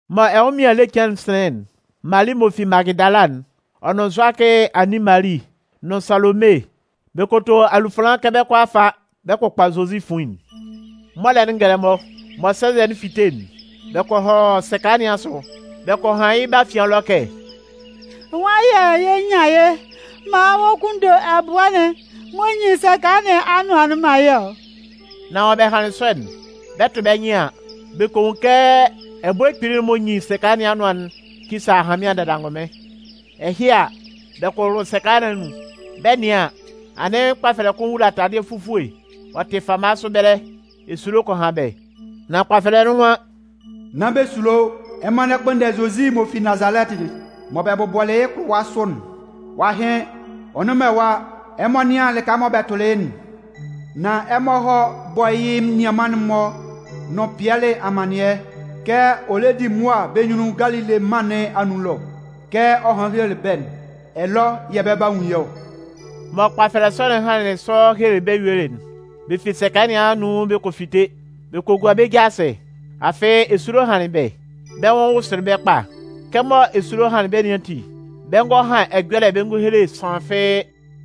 Mɔ ɛnwʋnmɩan ele cɩan'n sɩnlɩn'n, Mali m'ɔ fi Magɩdala'n, ɔ nʋn Zʋakɩ anin Mali, nʋn Salome, bɛ kɔ to alufanlan kɛ bɛ 'kɔ a fa bɛ kɔ kpʋkpa Zozi fuin'n. Mɔlɛ'n ngɛlɛmɔ, mɔ sɛnzɛ'n 'fite'n, bɛ kɔ hɔ sɛka nɩn asʋ. Bɛ kɔ han yɩ́ bɛ́ afian ɛlɔ kɛ: “Nwan yɛ̂ yɛ nyan yɩ́ maan ɔ kunndo ɛbʋɛ'n m'ɔ nyin sɛka nɩn anʋan'n man yɛ́ ɔ?” Nan mɔ bɛ hanlɩn sɔ'n, bɛ 'tʋ bɛ́ nyɩn an, bɛ kɔ nwun kɛ ɛbʋɛ kpili'n m'ɔ nyin sɛka nɩn anʋan'n kisa ahanmɩan dada angʋnmɩn. Ɛhɩ a, bɛ kɔ wʋlʋ sɛka nɩn anun. Bɛ 'nɩan an, anɩn kpafɛlɛ kʋn wula taladɩɛ fufue ɔ tɩ fama sʋ ɛbɛlɛ. Esulo kɔ han bɛ́. Nan kpafɛlɛ'n nwan: “Nán bɛ sulo. Ɛmɔ lɛ kpʋnndɛ Zozi m'ɔ fi Nazalɛtɩ'n, mɔ bɛ bʋbɔlɩ yɩ́ kʋlʋwa sʋ'n? Ɔ'a hɩn. Ɔ nnʋn man ɛwa. Ɛmɔ nɩ́an lɩka mɔ bɛ tʋlɩ yɩ́'n. Nan ɛmɔ hɔ́ bɔ́ yɩ́ menian'n-mɔ nʋn Pɩɛlɩ amannɩɛ kɛ ɔ lɛ di mʋa bɛ́ nyunnun Galile mân nɩn anun ɛlɔ. Kɛ ɔ hanlɩn helelɩ bɛ́'n, ɛlɔ yɛ̂ bɛ 'ba nwun yɩ́ ɔ.” Mɔ kpafɛlɛ sɔ'n hanlɩn sɔ helelɩ bɛ́ yuelɩ'n, bɛ fi sɛka nɩn anun bɛ kɔ fite. Bɛ kɔ gua bɛ́ ja asɩ. Afɩ esulo hanlɩn bɛ́, bɛ́ nwʋn wʋsʋlɩ bɛ́ kpa. Kɛmɔ esulo hanlɩn bɛ́ nɩn ati, bɛ ngɔ han ɛjɔlɛ bɛ ngɔ hele sʋanlan fɩ́ɩ́. [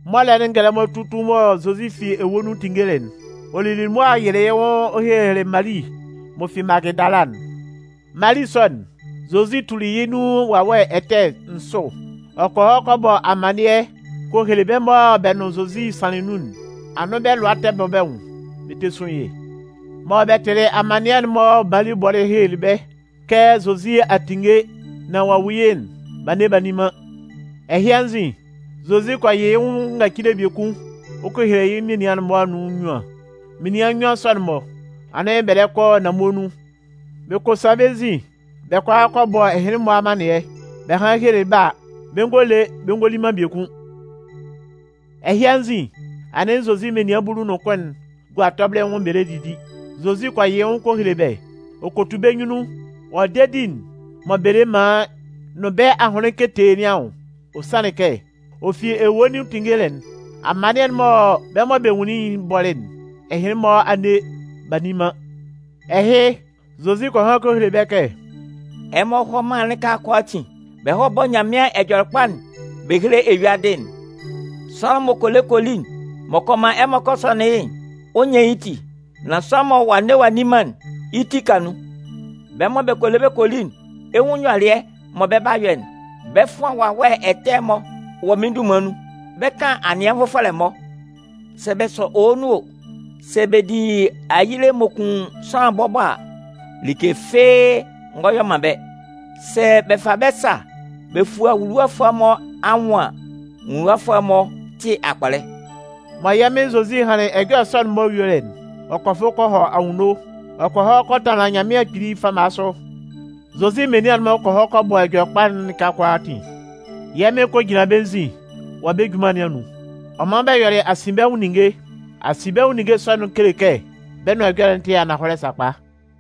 Mɔlɛ'n ngɛlɛmɔ tutun mɔ Zozi fi ewue nun tinngelɩ'n, ɔ lili mʋa ɔ yɩlɩ yɩ́ nwʋn ɔ helelɩ Mali m'ɔ fi Magɩdala'n. Mali sɔ'n, Zozi tuli yɩ́ nun wawɛ ɛtɛ nsʋ. Ɔ kɔ hɔ kɔ bɔ amannɩɛ kɔ hele bɛ́ mɔ bɛ nʋn Zozi sanlɩn nun'n. Anɩn bɛ́ lʋa tɛ bɔ bɛ́ nwʋn bɛ tɛ sun yɩ́. Mɔ bɛ tɩlɩ amannɩɛ'n mɔ Mali bɔlɩ helelɩ bɛ́ kɛ Zozi a tinnge nán ɔ'a nwun yɩ́'n, b'a nne b'a nni man. Ɛhɩ anzin, Zozi kɔ yɩ yɩ́ nwʋn ngacile biekun ɔ kɔ hele yɩ́ menian'n-mɔ anun nnyuan. Menian nnyuan sɔ'n-mɔ, anɩn bɛ lɛ kɔ nanmue nun. Bɛ kɔ sa bɛ́ nzin bɛ kɔ a kɔ bɔ ɛhɩnlɩn-mɔ amannɩɛ. Bɛ hanlɩn helelɩ bɛ́ a, bɛ ngɔ le bɛ ngɔ li man biekun. Ɛhɩ anzin, anɩn Zozi menian bulu nʋn kʋn'n gua tɔbɩlɩ nwʋn bɛ lɛ didi. Zozi kɔ yɩ yɩ́ nwʋn ɔ kɔ hele bɛ́. Ɔ kɔ tu bɛ́ nyunnun wɔ dedi'n mɔ bɛ le man yɩ́ nʋn bɛ́ ahʋnlɩn ketee nɩn anwʋn. Ɔ sanlɩn kɛ, ɔ fi ewue nun tinngelɩ'n, amannɩɛ'n mɔ bɛ́ mɔ bɛ nwunlin yɩ́'n bɔlɩ'n, ɛhɩnlɩn-mɔ a nne b'a nni man. Ɛhɩ, Zozi kɔ han kɔ hele bɛ́ kɛ: “Ɛmɔ hɔ́ mân'n lɩka kʋalaatin, bɛ hɔ́ bɔ́ Nyanmɩan Ɛjɔlɛkpa'n bɛ héle eyuadɩ'n. Sʋanlan m'ɔ kɔ le kɔ li, m'ɔ kɔ man ɛmɔ kɔ sɔnɩn yɩ́'n, ɔ 'nyan yɩ́ ti. Nan sʋanlan mɔ ɔ'a nne ɔ'a nni man'n, yɩ́ ti 'ka nun. Bɛ́ mɔ bɛ kɔ le bɛ kɔ li'n, ɛ 'nwun nyɔlɩɛ mɔ bɛ 'ba yɔ'n: Bɛ 'fʋan wawɛ ɛtɛ'n-mɔ wɔ mɩ́n dunman nun. Bɛ 'kan anɩɛ nvʋfɔlɛ-mɔ. Sɛ bɛ sɔ owo nun o, sɛ bɛ di ayile m'ɔ kun sʋanlan bɔbɔ a, like fɩ́ɩ́ ngɔ yɔ man bɛ́. Sɛ bɛ fa bɛ́ sa bɛ fua nwuluwafʋɛ'n-mɔ anwʋn an, nwuluwafʋɛ'n-mɔ 'tɩ akpɔlɛ.” Mɔ yɛ́ Mɩn Zozi hanlɩn ɛjɔlɛ sɔ'n-mɔ yuelɩ'n, ɔ kɔ fʋ kɔ hɔ anwunno. Ɔ kɔ hɔ kɔ tanlan Nyanmɩan Kpili fama sʋ. Zozi menian'n-mɔ kɔ hɔ kɔ bɔ Ɛjɔlɛkpa'n lɩka kʋalaatin. Yɛ́ Mɩn kɔ jinlan bɛ́ nzin wɔ bɛ́ junman nɩn anun. Ɔ man bɛ yɔlɩ asinbɛnwʋn ninnge. Asinbɛnwʋn ninnge sɔ'n-mɔ kele kɛ bɛ́ nʋan ɛjɔlɛ'n tɩ ananhɔlɛ sakpa.]